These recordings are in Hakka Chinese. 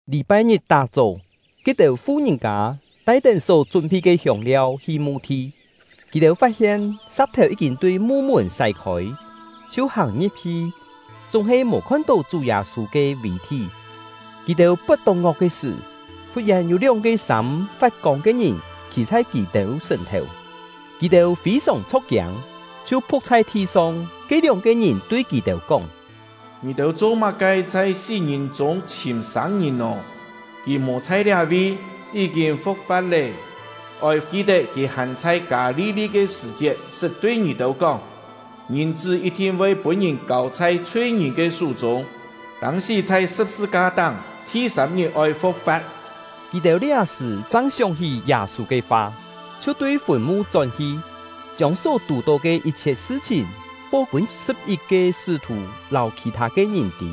Lî-pai-ngit tá-chó, ke-têu fu-ngìn-kâ tai-tén só chún-phi ke hiông-liau hi mu-thi. Kì-têu fat-hien sa̍k-thèu yí-kîn tui mu-mùn sái-khôi, chhiu hàng-ngi̍p-hi, chúng-he mò khon-tó Chú Yâ-sû ke vì-thí. Kì-têu pot-tok-ngok ke sṳ̀, fut-yèn yû lióng-ke sâm fat-kông ke ngìn khî chhai kì-têu sùn-thèu; kì-têu fî-sòng chho̍k-kiâng, chhiu phu̍k chhai thi-song. Ke lióng-ke ngìn tui kì-têu kóng: “Ngì-têu cho-má-ke chhai sí-ngìn chûng chhìm sâng-ngìn nò? Kì mò chhai liá-vi, yí-kîn fu̍k-fa̍t lé! Oi ki-tet kì hàn chhai Kâ-li-li ke sṳ̀-chiet sṳt tui ngì-têu kóng: ‘Ngìn-chṳ́ yit-thin voi pûn-ngìn kâu chhai chhui-ngìn ke sú-chûng, tâng-sí chhai sṳ̍p-sṳ-ka-táng, thi-sâm-ngit oi fu̍k-fa̍t.’” Kì-têu liá-sṳ̀ chang sióng-hí Yâ-sû ke fa, chhiu tui fùn-mu chón-hi, chiông só tù-tó ke yit-chhiet sṳ-chhìn po pûn sṳ̍p-yit-ke sṳ́-thù lâu khì-thâ ke ngìn tî.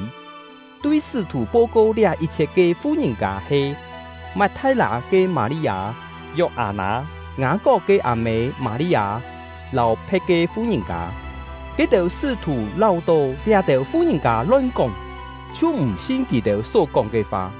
Tui sṳ́-thù po-ko liá yit-chhiet ke fu-ngìn-kâ he: Mat-thai-lâ ke Mâ-li-â, Yok-â-nâ, Ngâ-kok ke â-mê Mâ-li-â, lâu phe̍t ke fu-ngìn-kâ. Ke-têu sṳ́-thù láu-tó liá-têu fu-ngìn-kâ lon-kóng, chhiu m̀ sin kì-têu só kóng ke fa.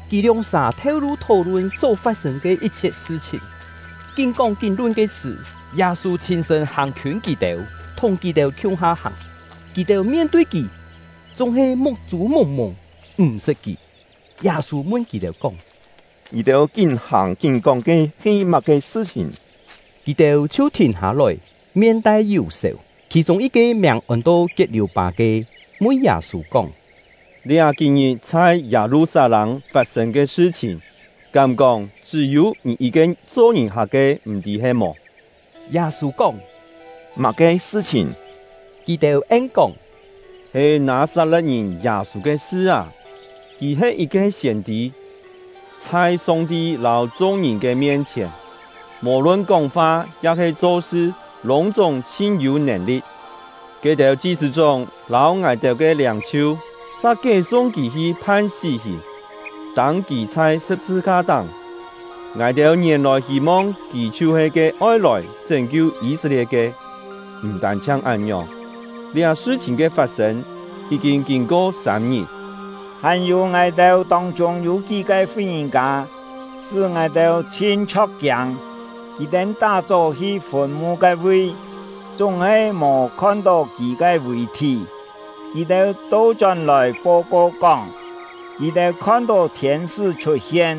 Kì lióng-sà theu-lu thó-lun só fat-sên ke yit-chhiet sṳ-chhìn. Kín kóng kín lun ke sṳ̀, Yâ-sû chhîn-sṳ̂n hàng-khiûn kì-têu, thùng kì-têu khiung-ha hàng; kì-têu mien-tui kì, chúng-he muk-chû mùng-mùng m̀-sṳt kì. Yâ-sû mun kì-têu kóng: “Ngì-têu kín hàng kín kóng ke he má-ke sṳ-chhìn?” Kì-têu chhiu thìn hâ-lòi, mien tai yù-sèu. Khì-chûng yit-ke miàng ôn-to Kiet-liù-pâ ke, mun Yâ-sû kóng: “Liá kí-ngit chhai Yâ-lu-sat-lâng fat-sên ke sṳ-chhìn, kám kóng chṳ́-yû ngì yit-ke cho ngìn-hak ke m̀-tî he-mò?” Yâ-sû kóng: “Má-ke sṳ-chhìn?” Kì-têu en-kóng: “He Nâ-sat-le̍t-ngìn Yâ-sû ke sṳ â! Kì he yit-ke siên-tî, chhai Song-ti lâu chung-ngìn ke mien-chhièn, mò-lun kóng-fa ya-he cho-sṳ lûng-chúng chhin-yû nèn-li̍t; ke-têu chi-sṳ̂-chóng lâu ngài-têu ke liâng-chhiu sa kié-sung kì hi phan sí-hìn, tâng kì chhai sṳ̍p-sṳ-ka-táng. Ngài-têu ngièn-lòi hî-mong kì chhiu-he ke oi lòi chṳ́n-kiu Yî-set-lie̍t ke! M̀ tân-chhiang án-ngiòng, liá sṳ-chhìn ke fat-sên yí-kîn kîn-ko sâm-ngit. Hàn-yû, ngài-têu tông-chûng yû kí-ke fu-ngìn-kâ, sṳ́ ngài-têu chhin chho̍k-kiâng. Kì-têu tá-chó hi fùn-mu ke-vi, chúng-he mò khon-tó kì ke vì-thí. Kì-têu to-chón-lòi po-ko kóng, kì-têu khon-tó thiên-sṳ́ chhut-hien,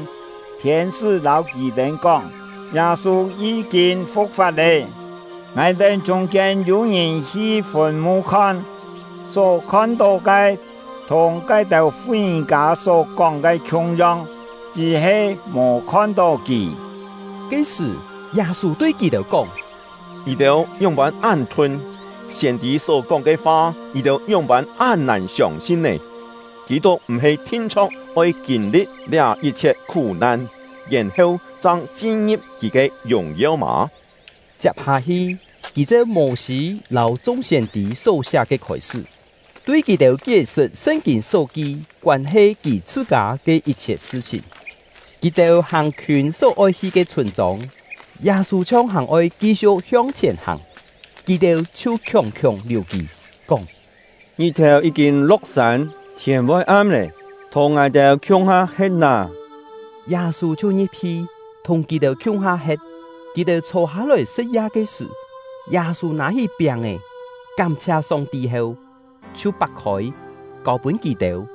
thiên-sṳ́ lâu kì-têu kóng, Yâ-sû yí-kîn fu̍k-fa̍t lé. Ngài-têu chûng-kiên yû-ngìn hi fùn-mu khon, só khon-tó ke thùng ke-têu fu-ngìn-kâ só kóng ke khiung-yong, chṳ́-he mò khon-tó kì.” Ke-sṳ̀, Yâ-sû tui kì-têu kóng: “Ngì-têu ngióng-pân án thun! Siên-tî só-kóng ke fa, ngì-têu ngióng-pân án nàn siông-sin nè? Kî-tuk m̀-he thin-chho̍k oi kîn-li̍t liá yit-chhiet khú-nan, yèn-heu chang chin-ngi̍p kì ke yùng-yeu mâ?” Chiap-hâ-hi, kì cheu Mô-sî lâu chung siên-tî só siá ke khôi-sṳ́, tui kì-têu kié-sṳt Sṳn-kîn só ki koân-he kì chhṳ-kâ ke yit-chhiet sṳ-chhìn. Kì-têu hàng-khiûn só-oi hi ke chhûn-chông, Yâ-sû chhiong hàn-oi ki-siu̍k hiong-chhièn hàng, kì-têu chhiu khiòng-khiòng liù kì, kóng: “Ngit-thèu yí-kîn lo̍k-sân, thiên voi am lé, thùng ngài-têu khiung-ha he̍t nâ!” Yâ-sû chhiu ngi̍p-hi, thùng kì-têu khiung-ha he̍t. Kì-têu chhô-hâ-lòi sṳ̍t-ya ke sṳ̀, Yâ-sû nâ-hí piáng-è, kám-chhia Song-ti heu, chhiu pak-khôi, kâu-pûn kì-têu.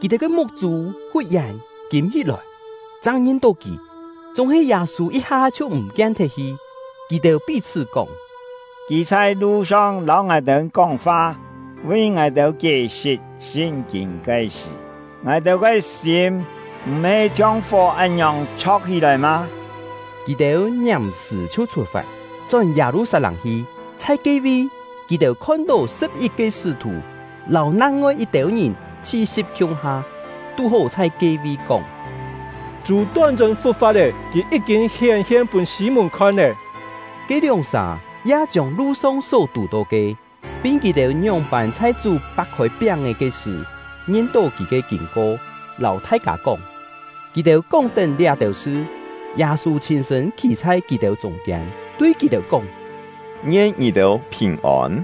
Kì-têu ke muk-chû fut-yèn kîm-hí-lòi, chang ngin-tó kì; chúng-he Yâ-sû yit-ha chhiu m̀ kien thet-hi. Kì-têu pí-chhṳ́ kóng: “Kì chhai lu-song lâu ngài-têu kóng-fa, vi ngài-têu kié-sṳt Sṳn-kîn ke sṳ̀, ngài-têu ke sîm m̀-he chhiong fó án-ngiòng chho̍k-hí-lòi mâ?” Kì-têu ngiàm-sṳ̀ chhiu chhut-fat, chón Yâ-lu-sat-lâng hi. Chhai ke-vi, kì-têu khon-tó sṳ̍p-yit-ke sṳ́-thù lâu nang-ngoi yit-têu ngìn chhi-si̍p khiung-ha, tú-hó chhai ke-vi kóng: “Chú ton-chṳ̂n fu̍k-fa̍t lé; kì yí-kîn hién-hien pûn Sî-mùn khon lé!” Ke lióng-sà ya chiông lu-song só tù-tó ke, pin kì-têu ngióng-pân chhai Chú pak-khôi piáng-è ke sṳ̀ ngin-tó kì ke kîn-ko, lâu thai-kâ kóng. Kì-têu kóng-tén liá-têu sṳ, Yâ-sû chhîn-sṳ̂n khî chhai kì-têu chûng-kiên, tui kì-têu kóng: “Ngien ngì-têu phìn-ôn!”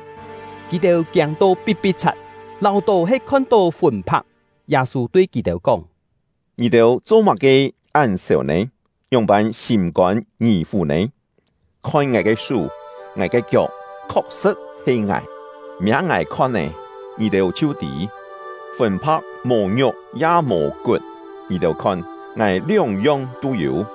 Yû-têu kú-kién mò: “tui kì-têu kóng: ‘Ngien ngì-têu phìn-ôn!’” Kì-têu kiâng-to pi̍t-pi̍t-chhat, láu-tó he khon-tó fùn-phak. Yâ-sû tui kì-têu kóng: “Ngì-têu cho-má-ke án sèu nè? Ngióng-pân sîm-kôn ngì-fù nè? Khon ngài ke sú, ngài ke kiok! Khok-sṳ̍t he ngài! Miâ ngài khon-é, ngì-têu chhiu tî; fùn-phak mò ngiuk ya mò kut, ngì-têu khon, ngài lióng-yong tû yû.”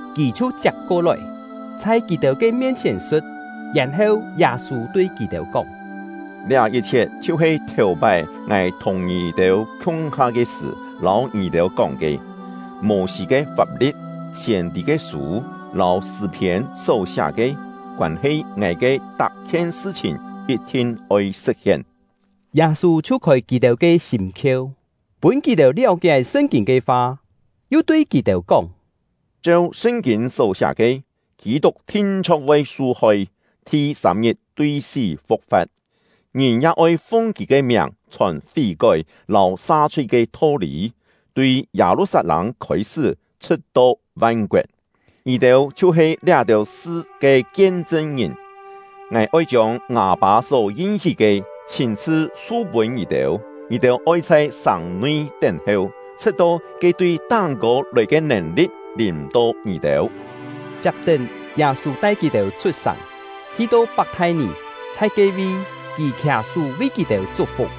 Kì chhiu chiap-ko-lòi, chhai kì-têu ke mien-chhièn sṳ̍t. Yèn-heu, Yâ-sû tui kì-têu kóng: “Liá yit-chhiet chhiu-he thèu-pái ngài thùng ngì-têu khiung-ha ke sṳ̀ lâu ngì-têu kóng ke: Mô-sî ke fap-li̍t, siên-tî ke sû, lâu Sṳ̂-phiên só siá ke, koân-he ngài ke tak-khien sṳ-chhìn yit-thin oi sṳ̍t-hien.” Yâ-sû chhiu khôi kì-têu ke sîm-khieu, pûn kì-têu liáu-kié Sṳn-kîn ke fa, yu tui kì-têu kóng: “Cheu Sṳn-kîn só siá ke, Kî-tuk thin-chho̍k voi su-hoi, thi-sâm-ngit tui sí fu̍k-fa̍t, ngìn ya oi fung kì ke miàng chhòn fí-kói lâu sa-chhui ke tho-lî, tui Yâ-lu-sat-lâng khôi-sṳ́, chhṳ̍t-to van-koet. Ngì-têu chhiu-he liá-têu sṳ ke kien-chṳn-ngìn. Ngài oi chiông ngâ Pâ só yin-hí ke, chhîn-chhṳ su-pûn ngì-têu; ngì-têu oi chhai sàng-nui tén-heu, chhṳ̍t-to ke tui táng-kô lòi ke nèn-li̍t lìm-to ngì-têu.” Chiap-tén, Yâ-sû tai kì-têu chhut-sàng, hi-to Pak-thai-nì. Chhai ke-vi, kì khià-sú vi kì-têu chuk-fuk.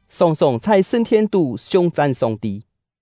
sòng-sòng chhai sṳn-thien-tú siung-chan Song-ti.